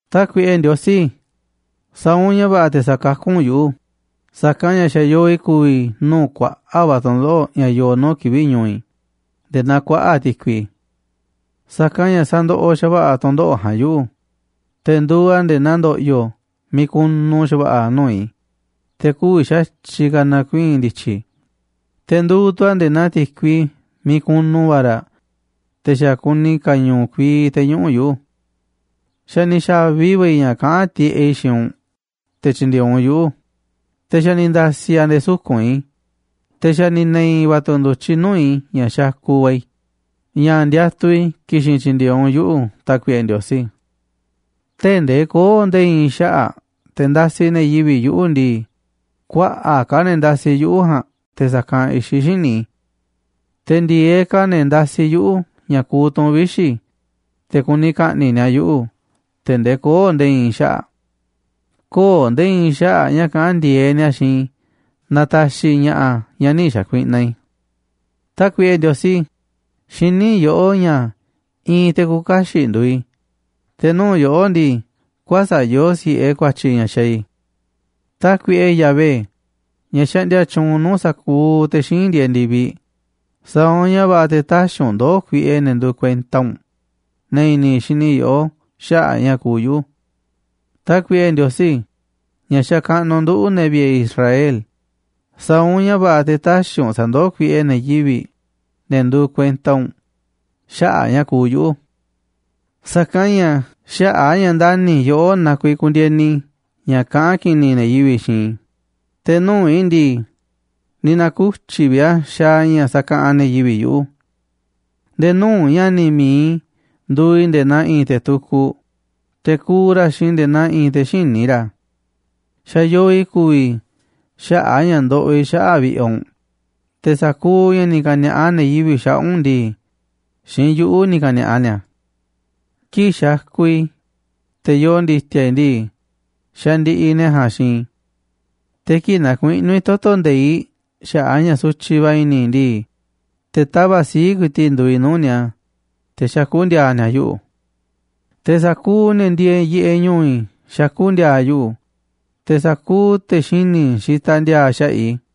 Tákuiꞌe Ndiosí, sa̱a̱ u̱nꞌ ña̱ va̱ꞌa̱ te̱ sakakú u̱nꞌ yuꞌu̱, sa̱kanꞌ ña̱ xa̱ yoo i̱ ku̱vi̱ i̱ nuu̱ꞌ kuaꞌa̱ꞌ va̱ tu̱ndoꞌo̱ꞌ ña̱ yoo nuu̱ꞌ kivi̱ꞌ ñu̱u̱ i̱ nde̱e̱ naa kuaꞌa̱ꞌ ti̱kui. Sa̱kanꞌ ña̱ sandoꞌoꞌ xa̱va̱ꞌa̱ tu̱ndoꞌo̱ꞌ ja̱a̱nꞌ yuꞌu̱, te̱ nduuꞌ a̱ nde̱e̱ naa ndo̱ꞌyo̱ miiꞌ kunu xa̱va̱ꞌa̱ nuu̱ꞌ i̱, te̱ kü̱vi̱ xa̱tyiꞌ ka̱ na̱kuii̱n ndi̱tyi̱ i̱, te̱ nduuꞌ tu̱ a̱ nde̱e̱ naa ti̱kui miiꞌ kunu va̱ raꞌ, te̱ xa̱ kuni ka̱ñu̱u̱ kuii te̱ñuꞌu̱ꞌ yuꞌu̱. Xa̱ ni̱ xa̱vi va̱ i̱ ña̱ kaꞌán tiꞌeꞌ i̱ xiinꞌ u̱nꞌ te̱ tyi̱ndi̱e̱eꞌ u̱nꞌ yuꞌu̱, te̱ xa̱ ni̱ nda̱si̱ a̱ nde̱e̱ suku̱nꞌ i̱, te̱ xa̱ ni̱ ne̱i̱ va̱ tu̱ ndu̱tyiꞌ nuu̱ꞌ i̱ ña̱ xakuꞌ va̱ i̱, ña̱ ndiatuꞌ i̱ ki̱xi̱n tyi̱ndi̱e̱eꞌ u̱nꞌ yuꞌu̱, Tákuiꞌe Ndiosí. Tee̱ꞌ ndee köo̱ꞌ nde̱e̱ i̱i̱n xaꞌa̱ꞌ te̱ ndasiꞌ ne̱ yivi̱ꞌ yuꞌu̱ ndii, kuaꞌa̱ꞌ ka̱ ne̱ ndasiꞌ yuꞌu̱ ja̱a̱nꞌ te̱ sa̱kanꞌ i̱xiꞌ xíniꞌ i̱. Te̱ ndi̱e̱eꞌ ka̱ ne̱ ndasiꞌ yuꞌu̱ ña̱ kuuꞌ tu̱n vixi̱, te̱ kuni ka̱ꞌni̱ꞌ ni̱a̱ yuꞌu̱ tee̱ꞌ ndee köo̱ꞌ nde̱e̱ i̱i̱n xaꞌa̱ꞌ. Kö̱o̱ nde̱e̱ i̱i̱n xaꞌa̱ꞌ ña̱ kaꞌán ndi̱e̱eꞌ ni̱a̱ xiinꞌ i̱ na̱ta̱xi̱ i̱ ña̱ꞌa̱ ña̱ nï̱ xa̱kuiꞌnaꞌ i̱. Tákuiꞌe Ndiosí, xiní yoꞌó ña̱ i̱i̱n te̱ küuꞌ kaxiꞌ nduuꞌ i̱, te̱ nuu̱ꞌ yoꞌó ndii, kuäsa̱ꞌ yoo si̱ꞌe ku̱a̱tyi̱ ña̱ xaaꞌ i̱. Tákuiꞌe Yahvé, ña̱ xaꞌndia tyuunꞌ nuu̱ꞌ sa̱kuuꞌ te̱ xíinꞌ ndieeꞌ ndi̱viꞌ, sa̱a̱ u̱nꞌ ña̱ va̱ꞌa̱ te̱ täxiꞌ u̱nꞌ ndoo̱ kuiꞌe ne̱ nduuꞌ kuenta u̱nꞌ, ne̱ i̱ni̱ xini yoꞌó xaꞌa̱ꞌ ña̱ kuuꞌ yuꞌu̱. Tákuiꞌe Ndiosí, ña̱ xakaꞌnuꞌ nduꞌu̱ꞌ, ne̱ vi̱ꞌe̱ Israel, sa̱a̱ u̱nꞌ ña̱ va̱ꞌa̱ te̱ tä̱xi̱ u̱nꞌ sa̱ndoó kuiꞌe ne̱ yivi̱ꞌ, ne̱ nduuꞌ kuenta u̱nꞌ, xaꞌa̱ꞌ ña̱ kuuꞌ yuꞌu̱. Sa̱kanꞌ ña̱ xaꞌa̱ꞌ a̱ ña̱ ndani̱ i̱ yoꞌó na kuiiꞌ kundieni i̱ ña̱ kaꞌán ki̱ni̱ ne̱ yivi̱ꞌ xiinꞌ i̱, te̱ nuu̱ꞌ i̱ ndii, ni̱ na̱ku̱tyi̱ vi̱ꞌ a̱ xaaꞌ ña̱ sakaꞌanꞌ ne̱ yivi̱ꞌ yuꞌu̱. Nde̱e̱ nuu̱ꞌ ña̱ni̱ mi̱iꞌ i̱ nduuꞌ i̱ nde̱e̱ naa i̱i̱n te̱ tukuꞌ, te̱ kuuꞌ ra̱ xiinꞌ i̱ nde̱e̱ naa i̱i̱n te̱ xïní ra̱. Xa̱ yoo i̱ ku̱vi̱ i̱ xaꞌa̱ꞌ a̱ ña̱ ndoꞌoꞌ i̱ xaꞌa̱ꞌ vi̱ꞌe̱ u̱nꞌ, te̱ sa̱kuuꞌ ña̱ ni̱ ka̱ni̱a̱ꞌa ne̱ yivi̱ꞌ xaꞌa̱ꞌ u̱nꞌ ndii, xiinꞌ yuꞌu̱ ni̱ ka̱ni̱a̱ꞌa ni̱a̱. Kii̱ꞌ xakuꞌ i̱, te̱ yoo ndi̱ti̱a̱ i̱ ndii, xandiꞌiꞌ ne̱ ja̱a̱nꞌ xiinꞌ i̱. Te̱ kii̱ꞌ nakuiꞌnú i̱ toto̱ nde̱iꞌ xaꞌa̱ꞌ a̱ ña̱ sutyiꞌ va̱ i̱ni̱ i̱ ndii, te̱ tava̱ꞌ sii̱ꞌ ku̱i̱ti̱ꞌ nduuꞌ i̱ nuu̱ꞌ ni̱a̱, te̱ xakú ndi̱a̱a̱ ni̱a̱ yuꞌu̱. Te̱ sa̱kuuꞌ ne̱ ndieeꞌ yiꞌeꞌ ñu̱u̱ i̱ xakú ndi̱a̱a̱ yuꞌu̱, te̱ sa̱kuuꞌ te̱ xini̱ xitaꞌ ndi̱a̱a̱ xaꞌa̱ꞌ i̱.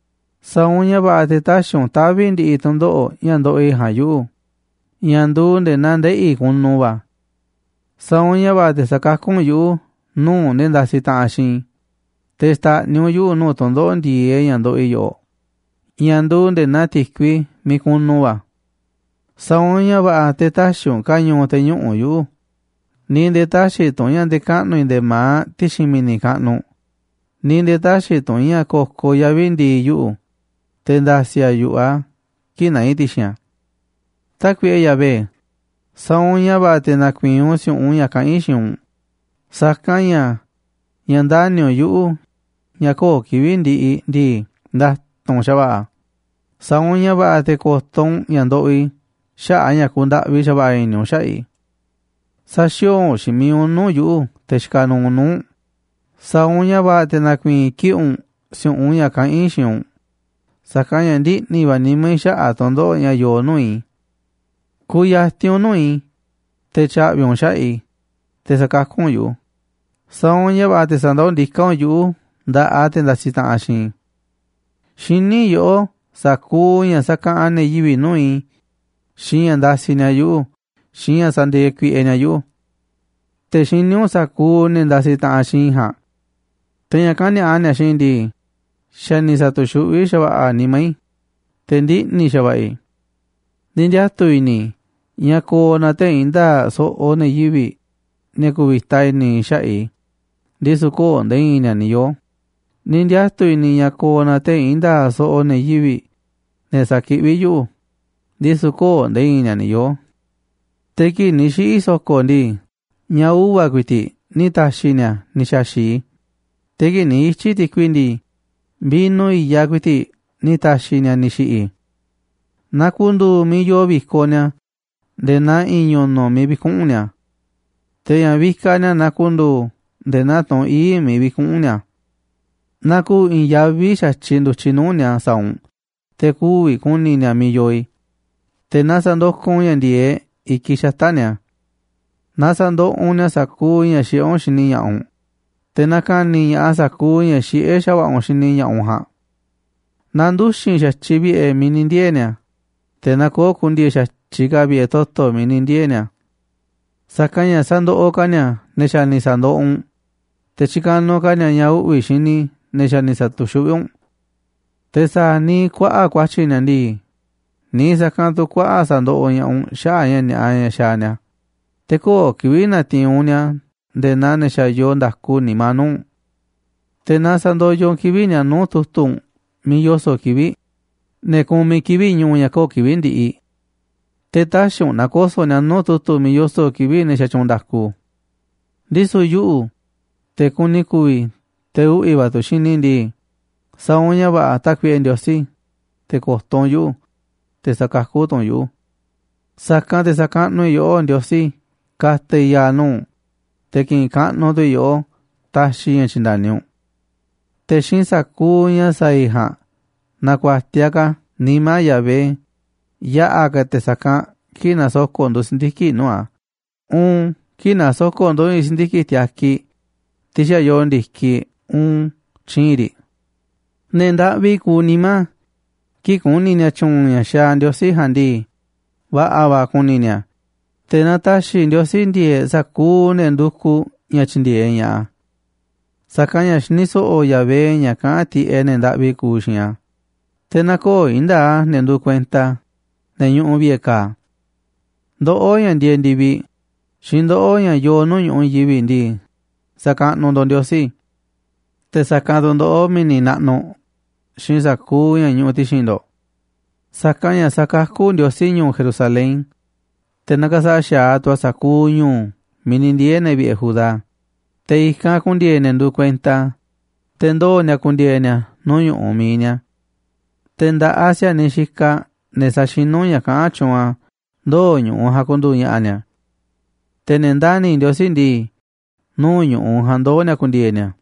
Sa̱a̱ u̱nꞌ ña̱ va̱ꞌa̱ te̱ tä̱xi̱ u̱nꞌ tavi̱ ndi̱ꞌi̱ tu̱ndoꞌo̱ꞌ ña̱ ndoꞌoꞌ i̱ ja̱a̱nꞌ yuꞌu̱ ña̱ nduuꞌ nde̱e̱ naa ndeꞌi̱ kunu va̱. Sa̱a̱ u̱nꞌ ña̱ va̱ꞌa̱ te̱ sa̱kakú u̱nꞌ yuꞌu̱ nuu̱ꞌ ne̱ ndasiꞌ taꞌanꞌ xiinꞌ i̱, te̱ xta̱ꞌniꞌ u̱nꞌ yuꞌu̱ nuu̱ꞌ tu̱ndoꞌo̱ꞌ ndi̱e̱eꞌ ña̱ ndoꞌoꞌ i̱ yoꞌoꞌ ña̱ nduuꞌ nde̱e̱ naa ti̱kui miiꞌ kunu va̱. Sa̱a̱ u̱nꞌ ña̱ va̱ꞌa̱ te̱ tä̱xi̱ u̱nꞌ ka̱ñu̱u̱ te̱ñuꞌu̱ꞌ yuꞌu̱, ni̱ nde̱e̱ tä̱xi̱ tu̱ u̱nꞌ ña̱ nde̱kaꞌnu̱ i̱ nde̱e̱ ma̱aꞌ ti̱xi̱n mi̱ni̱ kaꞌnuꞌ, ni̱ nde̱e̱ tä̱xi̱ tu̱ u̱nꞌ ña̱ ko̱koꞌ yavi̱ ndi̱i̱ yuꞌu̱, te̱ nda̱si̱ a̱ yu̱ꞌuꞌ a̱ kii̱ꞌ naá i̱ ti̱xi̱n a̱. Tákuiꞌe Yahvé, sa̱a̱ u̱nꞌ ña̱ va̱ꞌa̱ te̱ na̱ku̱i̱i̱n u̱nꞌ si̱u̱ꞌunꞌ ña̱ kaꞌán i̱ xiinꞌ u̱nꞌ, sa̱kanꞌ ña̱ ña̱ ndani̱ u̱nꞌ yuꞌu̱, ña̱ köo̱ꞌ kivi̱ꞌ ndiꞌiꞌ ndii, nda̱tu̱nꞌ xa̱va̱ꞌa̱ a̱, sa̱a̱ u̱nꞌ ña̱ va̱ꞌa̱ te̱ ko̱to̱ u̱nꞌ ña̱ ndoꞌoꞌ i̱ xaꞌa̱ꞌ a̱ ña̱ kundaꞌvi xa̱va̱ꞌa̱ i̱ni̱ u̱nꞌ xaꞌa̱ꞌ i̱. Sä̱xi̱o̱o̱ xiinꞌ mi̱iꞌ u̱nꞌ nuu̱ꞌ yuꞌu̱, te̱ xikaꞌ nuuꞌ nuu̱ꞌ u̱nꞌ, sa̱a̱ u̱nꞌ ña̱ va̱ꞌa̱ te̱ na̱ku̱i̱i̱n kiꞌi̱ꞌ u̱nꞌ si̱u̱ꞌunꞌ ña̱ kaꞌán i̱ xiinꞌ u̱nꞌ, sa̱kanꞌ ña̱ ndiꞌni̱ va̱ nimá i̱ xaꞌa̱ꞌ tu̱ndoꞌo̱ꞌ ña̱ yoo nuu̱ꞌ i̱. Ku̱ya̱ti̱n u̱nꞌ nuu̱ꞌ i̱ te̱ tya̱ꞌvi̱ u̱nꞌ xaꞌa̱ꞌ i̱, te̱ sa̱kakú u̱nꞌ yuꞌu̱, sa̱a̱ u̱nꞌ ña̱ va̱ꞌa̱ te̱ sa̱ndoó ndiká u̱nꞌ yuꞌu̱ nda̱ꞌaꞌ te̱ ndasiꞌ taꞌanꞌ xiinꞌ i̱. Xiní yoꞌó sa̱kuuꞌ ña̱ sakaꞌanꞌ ne̱ yivi̱ꞌ nuu̱ꞌ i̱, xiinꞌ ña̱ ndasiꞌ ni̱a̱ yuꞌu̱, xiinꞌ ña̱ sandieeꞌ kuiꞌe ni̱a̱ yuꞌu̱. Te̱ xiní u̱nꞌ sa̱kuuꞌ ne̱ ndasiꞌ taꞌanꞌ xiinꞌ i̱ ja̱a̱nꞌ. Te̱ ña̱ kani̱a̱ꞌa ni̱a̱ xiinꞌ i̱ ndii, xa̱ ni̱ sa̱tu̱xuꞌví xa̱va̱ꞌa̱ a̱ nimá i̱, te̱ ndiꞌni̱ xa̱va̱ꞌa̱ i̱. Ni̱ ndiatu̱ i̱ni̱ i̱ ña̱ ko̱o̱ na tee̱ꞌ i̱i̱n nda̱a̱ꞌ so̱ꞌo̱ ne̱ yivi̱ꞌ, ne̱ ku̱vi̱ta i̱ni̱ xaꞌa̱ꞌ i̱, ndisu̱ köo̱ꞌ nde̱e̱ i̱i̱n ni̱a̱ ni̱ yoo̱, ni̱ ndiatu̱ i̱ni̱ i̱ ña̱ ko̱o̱ na tee̱ꞌ i̱i̱n nda̱a̱ꞌ so̱ꞌo̱ ne̱ yivi̱ꞌ, ne̱ sa̱kiꞌví yuꞌu̱, ndisu̱ köo̱ꞌ nde̱e̱ i̱i̱n ni̱a̱ ni̱ yoo̱. Te̱ kii̱ꞌ ni̱ xiꞌi̱ i̱ so̱ko̱ ndii, ña̱ uva̱ ku̱i̱ti̱ꞌ ni̱ ta̱xi̱ ni̱a̱ ni̱ xa̱xi̱ꞌ i̱, te̱ kii̱ꞌ ni̱ ityi̱ i̱ ti̱kui ndii, vino i̱yaꞌ ku̱i̱ti̱ꞌ ni̱ ta̱xi̱ ni̱a̱ ni̱ xi̱ꞌi̱ i̱. Na ku̱ndu̱u̱ miiꞌ yoo vi̱koꞌ ni̱a̱ nde̱e̱ naa i̱i̱n ñu̱nu̱ꞌ miiꞌ vi̱kuꞌu̱n ni̱a̱. Te̱ ña̱ vikaꞌ ni̱a̱ na ku̱ndu̱u̱ nde̱e̱ naa tunꞌ ii̱ꞌ miiꞌ vi̱kuꞌu̱n ni̱a̱. Na ku̱u̱ i̱i̱n yaví xa̱tyiꞌ ndu̱tyiꞌ nuu̱ꞌ ni̱a̱ sa̱a̱ u̱nꞌ te̱ kü̱vi̱ ku̱ni̱ ni̱a̱ miiꞌ yoo i̱, te̱ na sa̱ndokoꞌ u̱nꞌ ña̱ ndi̱e̱eꞌ i̱kiꞌ xata̱ꞌ ni̱a̱. Na sa̱ndoꞌoꞌ u̱nꞌ ni̱a̱ sa̱kuuꞌ ña̱ xiꞌé u̱nꞌ xini ña̱ꞌaꞌ u̱nꞌ, te̱ na ka̱ni̱ ña̱ꞌaꞌ sa̱kuuꞌ ña̱ xiꞌé xa̱va̱ꞌa̱ u̱nꞌ xini ña̱ꞌaꞌ u̱nꞌ ja̱a̱nꞌ. Na nduxi̱n xa̱tyiꞌ vi̱ꞌe̱ miiꞌ ni̱ ndiee̱ ni̱a̱, te̱ na köo̱ꞌ ku̱ndi̱e̱e̱ xa̱tyiꞌ ka̱ vi̱ꞌe̱ toto̱ miiꞌ ni̱ ndiee̱ ni̱a̱. Sa̱kanꞌ ña̱ sa̱ndoꞌoꞌ ka̱ ni̱a̱ ne̱ xa̱ ni̱ sa̱ndoꞌoꞌ u̱nꞌ, te̱ tyikanuꞌ ka̱ ni̱a̱ ña̱ uꞌvi̱ xini ne̱ xa̱ ni̱ sa̱tu̱xuꞌví u̱nꞌ. Te̱ sa̱a̱ niiꞌ kuaꞌa̱ꞌ ku̱a̱tyi̱ ni̱a̱ ndii, niiꞌ sa̱kanꞌ tu̱ kuaꞌa̱ꞌ sa̱ndoꞌoꞌ ña̱ꞌaꞌ u̱nꞌ xaꞌa̱ꞌ ña̱ ni̱a̱ꞌa ña̱ xaaꞌ ni̱a̱, te̱ köo̱ꞌ kivi̱ꞌ na̱ti̱i̱n u̱nꞌ ni̱a̱ nde̱e̱ naa ne̱ xa̱ yoo nda̱ku nimá nuu̱ꞌ u̱nꞌ. Te̱ na sa̱ndoyoꞌ u̱nꞌ kivi̱ꞌ ni̱a̱ nuu̱ꞌ tu̱tu̱ u̱nꞌ miiꞌ yoso̱ꞌ kivi̱ꞌ, ne̱ kumiꞌ kivi̱ꞌ ñu̱u̱ ña̱ köo̱ꞌ kivi̱ꞌ ndiꞌiꞌ. Te̱ tä̱xi̱ u̱nꞌ na̱ko̱so̱ꞌ ni̱a̱ nuu̱ꞌ tu̱tu̱ miiꞌ yoso̱ꞌ kivi̱ꞌ ne̱ xatyuunꞌ nda̱ku. Ndisu̱ yuꞌu̱, te̱ kuni ku̱vi̱, te̱ uꞌvi̱ va̱ tu̱ xini i̱ ndii, sa̱a̱ u̱nꞌ ña̱ va̱ꞌa̱, Tákuiꞌe Ndiosí, te̱ ko̱to̱ u̱nꞌ yuꞌu̱, te̱ sa̱kakú tu̱ u̱nꞌ yuꞌu̱. Sa̱kanꞌ te̱ sa̱kaꞌnuꞌ i̱ yoꞌó, Ndiosí ka̱ta̱ i̱ ya̱a̱ nuu̱ꞌ u̱nꞌ, te̱ ki̱ꞌi̱n kaꞌnuꞌ tu̱ i̱ yoꞌó taxiꞌ i̱ ña̱ tyi̱nda̱ni u̱nꞌ. Te̱ xiinꞌ sa̱kuuꞌ ña̱ sa̱a̱ i̱ ja̱a̱nꞌ na̱ku̱a̱tiaꞌ ka̱ nimá Yahvé yaꞌa̱ ka̱ te̱ sa̱kanꞌ kii̱ꞌ nasoko̱ꞌ ndu̱ si̱ndiki̱ꞌ nuu̱ꞌ a̱, uun kii̱ꞌ nasoko̱ꞌ ndu̱ i̱i̱n si̱ndiki̱ꞌ tiakiꞌ, tiꞌ xa̱ yoo ndi̱kiꞌ, uun tyii̱nꞌ riꞌ. Ne̱ ndaꞌvi kuuꞌ nimá, kii̱ꞌ ku̱ni̱ ni̱a̱ tyu̱u̱n ña̱ xaaꞌ Ndiosí ja̱a̱nꞌ ndii, va̱ꞌa̱ va̱ ku̱ni̱ ni̱a̱, te̱ na ta̱xi̱ Ndiosí ndi̱e̱e̱ꞌ sa̱kuuꞌ ne̱ ndukuꞌ ña̱ tyi̱ndi̱e̱eꞌ ña̱ꞌaꞌ a̱. Sa̱kanꞌ ña̱ xini so̱ꞌo̱ Yahvé ña̱ kaꞌán tiꞌeꞌ ne̱ ndaꞌvi kuuꞌ xiinꞌ a̱, te̱ nä̱ko̱o̱ i̱i̱n nda̱a̱ꞌ a̱ ne̱ nduuꞌ kuenta a̱, ne̱ ñuꞌuꞌ vi̱ꞌe̱ ka̱a̱. Ndoꞌó, ña̱ ndieeꞌ ndi̱viꞌ, xiinꞌ ndoꞌó, ña̱ yoo nuu̱ꞌ ñu̱ꞌuꞌ i̱i̱n yivi̱ꞌ ndii, sa̱kaꞌnuꞌ ndo̱ꞌ Ndiosí, te̱ sa̱kanꞌ tu̱ ndoꞌó, mi̱ni̱ naꞌnuꞌ, xiinꞌ sa̱kuuꞌ ña̱ ñuꞌuꞌ ti̱xi̱n ndo̱ꞌ. Sa̱kanꞌ ña̱ sa̱kakú Ndiosí ñu̱u̱ Jerusalén, te̱ na̱ka̱sa̱ꞌa̱ xa̱aꞌ tu̱ a̱ sa̱kuuꞌ ñu̱u̱ miiꞌ ni̱ ndiee̱ ne̱ vi̱ꞌe̱ Judá, te̱ i̱kanꞌ ku̱ndi̱e̱e̱ ne̱ nduuꞌ kuenta a̱, te̱ ndoo̱ ni̱a̱ ku̱ndi̱e̱e̱ ni̱a̱ nuu̱ꞌ ñu̱ꞌuꞌ mi̱iꞌ ni̱a̱. Te̱ nda̱ꞌaꞌ si̱a̱niꞌ xikaꞌ ne̱ sa̱xinú ña̱ kaꞌán tyuunꞌ a̱ ndoo̱ ñu̱ꞌuꞌ ja̱a̱nꞌ ku̱ndu̱u̱ ña̱ꞌa̱ ni̱a̱. Te̱ ne̱ ndani̱ Ndiosí ndii, nuu̱ꞌ ñu̱ꞌuꞌ ja̱a̱nꞌ ndoo̱ ni̱a̱ ku̱ndi̱e̱e̱ ni̱a̱.